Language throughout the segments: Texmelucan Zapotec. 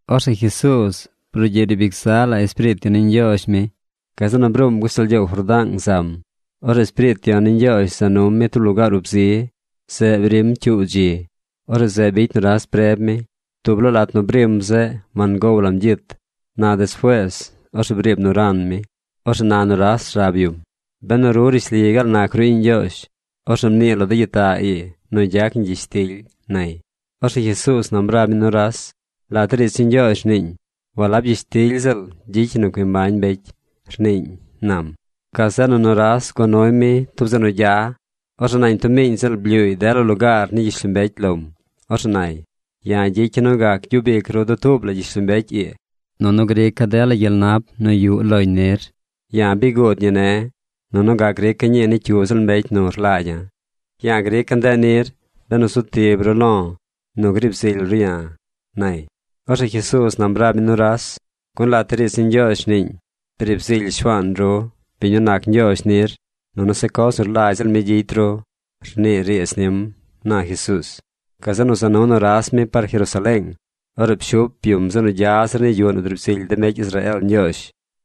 Orzeꞌ Jesuuz brugyiꞌ riib ic zaꞌ la Espiriit Yon ni Ñgyoozh mi. Gazeꞌ nu bruum gashtal gyoow Jordaang zam. Orzeꞌ Espiriit Yon ni Ñgyoozh za num mi tub lugaar ub zi. Zeꞌ brim cyuu dzi. Orzeꞌ zeꞌ bicy nuras preb mi. Dub laa lat nu brim zeꞌ wangow lam gyit. Na despuees, orzeꞌ briib nu ran mi. Orzeꞌ na nuras rab yum: ―Benu ru rishli gaal nac ru iꞌñ Ñgyoozh, orzeꞌ mnii lo de gyitaꞌ ii nu gyac ni gyishtily ―nay. Orzeꞌ Jesuuz nam rab mi nuras: ―Lat de riidz ni Ñgyoozh rniin: “Walab gyishtily ziꞌl gyicy ñi nu cui mbañ mbecy”, rniiñ ―nam. Gazeꞌ nu nuras gua nuy mi tub zeꞌ nu gya. Orzeꞌ nañ tub miiñ ziꞌl blyuuy dela lugaar ni gyishlombecy lom. Orzeꞌ nay: ―Ya̱ gyicya̱ nu gac gyub ic ru dutuub la gyishlombecy ii, nunu grica̱ dela gyel nap nu yuꞌ loñ nir. Ya̱ bi guud ñi ne̱, nunu gac grica̱ ñii ni cyu ziꞌl mbecy nu rlagya̱. Ya̱ grica̱ ndeꞌ nir benu zu tib ru lo̱ nu griib zily ru ya̱ ―nay. Orzeꞌ Jesuuz nam rab mi nuras: ―Gun lat de riidz ni Ñgyoozh rniin: “Briib zily Shuaan ru, biñ nu nac Ñgyoozh nir, nunu se coz nu rlagy ziꞌl mi gyicy ru”, rnii riidz nim ―na Jesuuz. Gazeꞌ nu za nu nuras mi par Jerusaleeng. Orzeꞌ pshup yum zeꞌ nu gya zir ni yuꞌ nu driib zily de mbecy Israeel Ñgyoozh.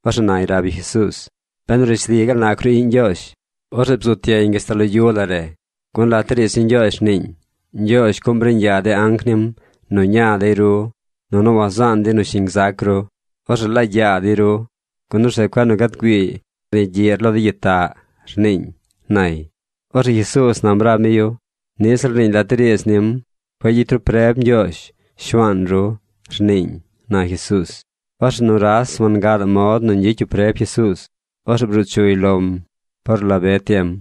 Orzeꞌ nay rab yu Jesuuz: ―Benu rishli gaal nac ru iꞌñ Ñgyoozh, orzeꞌ bzut yeñ gashtal lo yu la re. Gun lat de riidz ni Ñgyoozh rniiñ: Ñgyoozh cuꞌm riiñ yaa de anc nim nu ña dey ru, nunu wazaan dey nu shiñ gzac ru. Orzeꞌ lagy yaa dey ru, gun orzeꞌ cueꞌ nu gad güii par ni gyiꞌr lo de gyitaꞌ, rniiñ, nay. Orzeꞌ Jesuuz nam rab mi yu: ―Niꞌ ziꞌl rniiñ lat de riidz nim: “Cueꞌ gyicy ru preb Ñgyoozh, Shuaan ru”, rniiñ ―na Jesuuz. Orzeꞌ nuras wangadaꞌ mod nu ñgyicy yu preb Jesuuz. Orzeꞌ bruu chuy lom par la be tiem.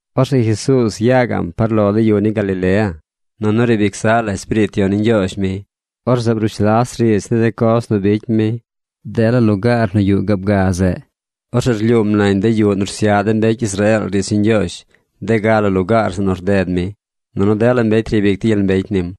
Orzeꞌ Jesuuz ya gaꞌm par lo de yu ni Galilea, nunu riib ic zaꞌ la Espiriit Yon ni Ñgyoozh mi. Orzeꞌ brush las riidz ni de coz nu bicy mi dela lugaar nu yuꞌ gaab ga zeꞌ. Orzeꞌ rlyuum nañ de yuꞌ nu rsyaꞌ de mbecy Israeel riidz ni Ñgyoozh de ga la lugaar zeꞌ nu rded mi. Nunu dela mbecy ryabic dey gyel mbecy nim.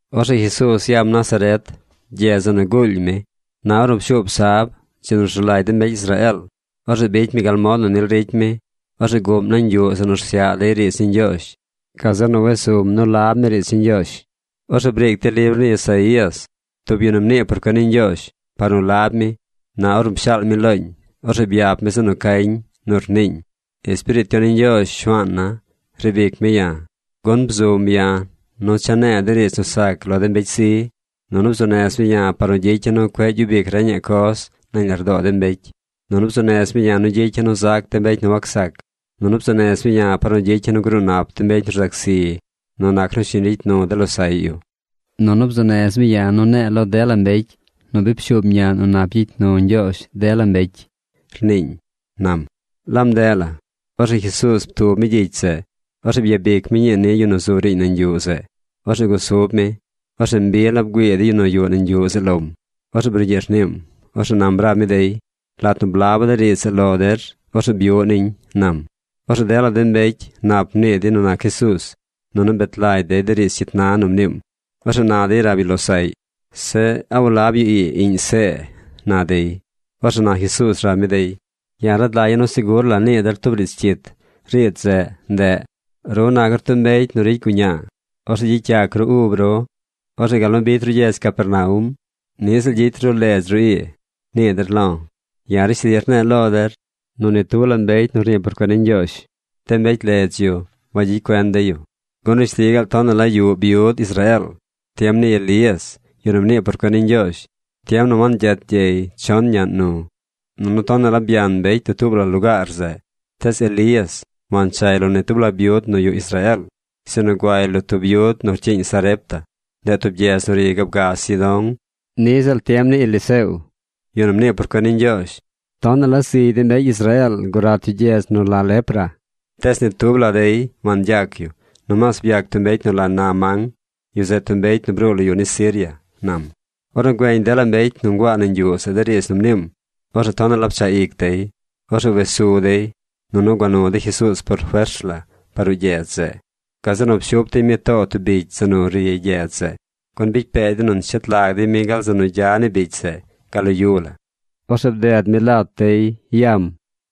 Orzeꞌ Jesuuz yam Nazaret, gyedz zeꞌ nu guul mi. Na ornu pshuub sab, dzi nu rzu lagy de mbecy Israeel, orzeꞌ bicy mi gal mod nu nil ricy mi. Orzeꞌ guꞌm nañ yuꞌ zeꞌ nu rsyaꞌ dey riidz ni Ñgyoozh. Gazeꞌ nu wes sum nu lab mi riidz ni Ñgyoozh. Orzeꞌ briic dey libr ni Isaías, tub yu nu rnii por cuen ni Ñgyoozh, par nu lab mi. Na ornu pshaal mi looñ, orzeꞌ byap mi zeꞌ nu cañ nu rniiñ: Espiriit Yon ni Ñgyoozh Shuaana̱ riib ic mi ya̱, gun bzum ya̱ nu cha̱ ne̱e̱ de riidz nu sac lo de mbecy zi. Nunu bzuu nez mi ya̱ par nu gyicya̱ nu cueꞌ gyub ic reñaꞌ coz nañ lardoo de mbecy. Nunu bzuu nez mi ya̱ nu gyicya̱ nu zac de mbecy nu wacsac. Nunu bzuu nez mi ya̱ par nu gyicya̱ nu gruu nap de mbecy nu rzac zi nu nac nu shiñ ricy nu de losaꞌy yu. Nunu bzuu nez mi ya̱ nu ne̱e̱ lo dela mbecy nu bi pshuub ñaꞌn nu nap gyicy nu Ñgyoozh dela mbecy, rniiñ, nam. Laab ndeꞌ la. Orzeꞌ Jesuuz ptub mi gyicy zeꞌ. Orzeꞌ byabic mi ñii ni yu nu zu riiñ nañ yuꞌ zeꞌ. Orzeꞌ gusub mi. Orzeꞌ mbi la bgüii de yu nu yuꞌ nañ yuꞌ zeꞌ lom. Orzeꞌ brugyiꞌ rniim. Orzeꞌ nam rab mi dey: ―Lat nu blaba̱ de riidz zeꞌ lo der, orzeꞌ byuꞌ niñ ―nam. Orzeꞌ dela mbecy nap mnii dey nu nac Jesuuz, nunu bet lagy dey de riidz cyit na nu mniim. Orzeꞌ na dey rab dey losaꞌy: ―Zeꞌ, ¿a walab yu ii iꞌñ See? ―na dey. Orzeꞌ na Jesuuz rab mi dey: ―Ya̱ rad lagya̱ nu segur la nii der tub riidz cyit. Riidz zeꞌ, ndeꞌ: “Ru nac ru tub mbecy nu ricy guñaa. Orzeꞌ gyicy yac ru ub ru. Orzeꞌ gal nu bicy ru gyedz Capernaum, niꞌ ziꞌl gyicy ru ledz ru ii”, nii der lo̱. Ya̱ rishli rne̱e̱ lo der nu ni tub la mbecy nu rnii por cuen ni Ñgyoozh, de mbecy ledz yu wagyicy cuen dey yu. Gun rishli gaal tonaꞌ la yuꞌ byud Israeel tiem ni Elías, yu nu mnii por cuen ni Ñgyoozh, tiem nu wangyet gyey chon naꞌñ nu. Nunu tonaꞌ la byan mbecy dutuub la lugaar zeꞌ. Tees Elías wanchay lo ni tub la byud nu yuꞌ Israeel, sinu guay lo tub byud nu rcyiiñ Sarepta. Ndeꞌ tub gyedz nu ri gaab ga Sidón. Niꞌ ziꞌl tiem ni Eliseo, yu nu mnii por cuen ni Ñgyoozh, tonaꞌ la zigy de mbecy Israeel gurat yu gyedz nu la lepra. Tees ni tub la dey wangyac yu. Nomaas byac tub mbecy nu la Naamán. Yu zeꞌ tub mbecy nu bruu lo yu ni Siria ―nam. Ornu güeñ dela mbecy nu nguaa nañ yuꞌ zeꞌ de riidz nu mniim, orzeꞌ tonaꞌ la pchaꞌ ic dey. Orzeꞌ wes su dey, nunu gua nu dey Jesuuz por fers la par ruꞌ gyedz zeꞌ. Gazeꞌ nu pshup dey mi too tub bicy zeꞌ nu ri gyedz zeꞌ, gun bicy pee dey nu nshet lag dey mi gal zeꞌ nu gya ni bicy zeꞌ, gal lo yu la. Orzeꞌ bded mi lat dey yam.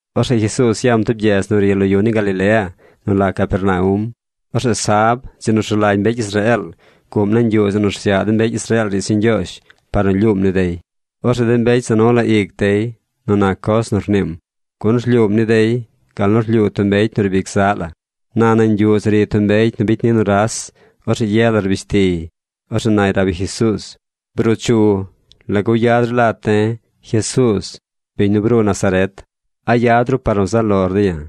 Orzeꞌ Jesuuz yam tub gyedz nu ri lo yu ni Galilea nu la Capernaum. Orzeꞌ sab, dzi nu rzu lagy mbecy Israeel, guꞌm nañ yuꞌ zeꞌ nu rsyaꞌ de mbecy Israeel riidz ni Ñgyoozh par nu lyuum ni dey. Orzeꞌ de mbecy za nu la ic dey nu nac coz nu rniim, gun rlyuum ni dey gal nu rlyuu tub mbecy nu riib ic zaꞌ la. Na nañ yuꞌ zeꞌ ri tub mbecy nu bicy ni nuras. Orzeꞌ ye la rbish tiy. Orzeꞌ nay rab yu Jesuuz: ―Bruu chu. ¿Lagu yad ru lat de̱, Jesuuz, biñ nu bruu Nazaret? ¿A yad ru par nu zaꞌ lor de̱ ya̱?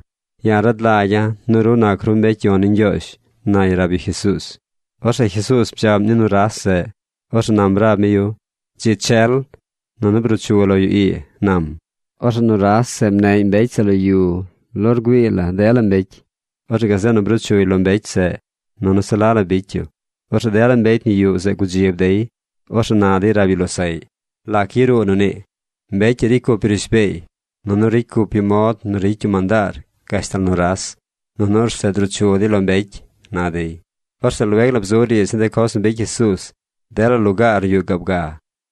Ya̱ rad lagya̱ nu ru nac ru mbecy yon ni Ñgyoozh ―nay rab yu Jesuuz. Orzeꞌ Jesuuz bdzaꞌm ni nuras zeꞌ. Orzeꞌ nam rab mi yu: ―Dzi chel, nunu bruu chu lo yu ii ―nam. Orzeꞌ nuras zeꞌ mneꞌy mbecy zeꞌ lo yu lo rgüii la dela mbecy. Orzeꞌ gazeꞌ nu bruu chuy lo mbecy zeꞌ, nunu se la la bicy yu. Orzeꞌ dela mbecy nu yuꞌ zeꞌ gudzib dey. Orzeꞌ na dey rab dey losaꞌy: ―¿Lac yaruu nu nii? ¡Mbecy ii ricy cup yu rishbeey, nunu ricy cup yu mod nu ricy yu mandaar gashtal nuras, nunu orzeꞌ druu chu dey lo mbecy! ―na dey. Orzeꞌ lueg la bzu riidz ni de coz nu bicy Jesuuz dela lugaar nu yuꞌ gaab ga.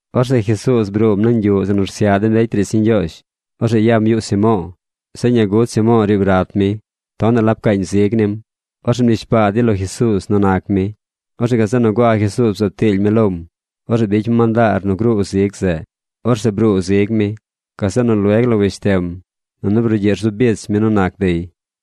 Orzeꞌ Jesuuz bruum nañ yuꞌ zeꞌ nu rsyaꞌ de mbecy riidz ni Ñgyoozh. Orzeꞌ yam yuꞌ Simo̱o̱. Zeꞌ ñaa gud Simo̱o̱ riib rat mi. Tonaꞌ la pcaañ zig nim. Orzeꞌ mnishbaa dey lo Jesuuz nu nac mi. Orzeꞌ gazeꞌ nu gua Jesuuz bzaab tily mi lom. Orzeꞌ bicy mi mandaar nu gruu zig zeꞌ. Orzeꞌ bruu zig mi. Gazeꞌ nu lueg la weshtem, nunu brugyiꞌ rzu bich mi nu nac dey.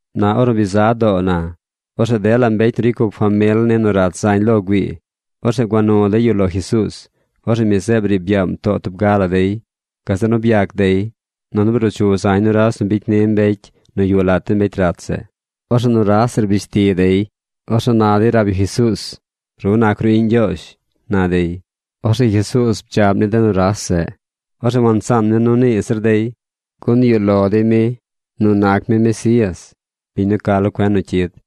Na ornu bi za doo na, orzeꞌ dela mbecy nu ricy cup famil ni nu rat zañ lo güii, orzeꞌ gua nu dey yu lo Jesuuz. Orzeꞌ mi zeꞌ briib yaam too tub ga la dey. Gazeꞌ nu byac dey. Nunu bruu chu zañ nuras nu bicy ni mbecy nu yuꞌ lat de mbecy rat zeꞌ. Orzeꞌ nuras zeꞌ rbish ti dey. Orzeꞌ na dey rab yu Jesuuz: ―¡Ru nac ru iꞌñ Ñgyoozh! ―na dey. Orzeꞌ Jesuuz bdzaꞌm ni de nuras zeꞌ. Orzeꞌ wansaan mi nu nii zir dey, gun yuꞌ lo dey mi nu nac mi Mesías, biñ nu ca lo cuen nu cyid.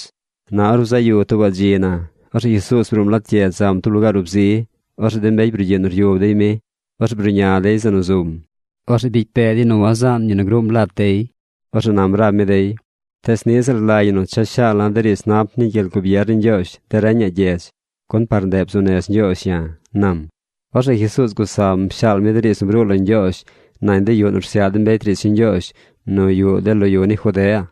Na or bzaꞌ yu tuubaꞌ dzi na, orzeꞌ Jesuuz bruum lat gyedz zam tub lugaar ub zi. Orzeꞌ de mbecy brugyiꞌ nu ryub dey mi. Orzeꞌ bruꞌña dey zeꞌ nu zum. Orzeꞌ bicy pee dey nu wazaan yu nu gruum lat dey. Orzeꞌ nam rab mi dey: ―Tees niꞌ ziꞌl rlagy ñi cha shaala̱ de riidz nap ni gyel gubier ni Ñgyoozh de reñaꞌ gyedz, gun par ndeꞌ bzuu nez Ñgyoozh ya̱ ―nam. Orzeꞌ Jesuuz gusam pshaal mi de riidz nu bruu lo Ñgyoozh nañ de yuꞌ nu rsyaꞌ de mbecy riidz ni Ñgyoozh nu yuꞌ de lo yu ni Judea.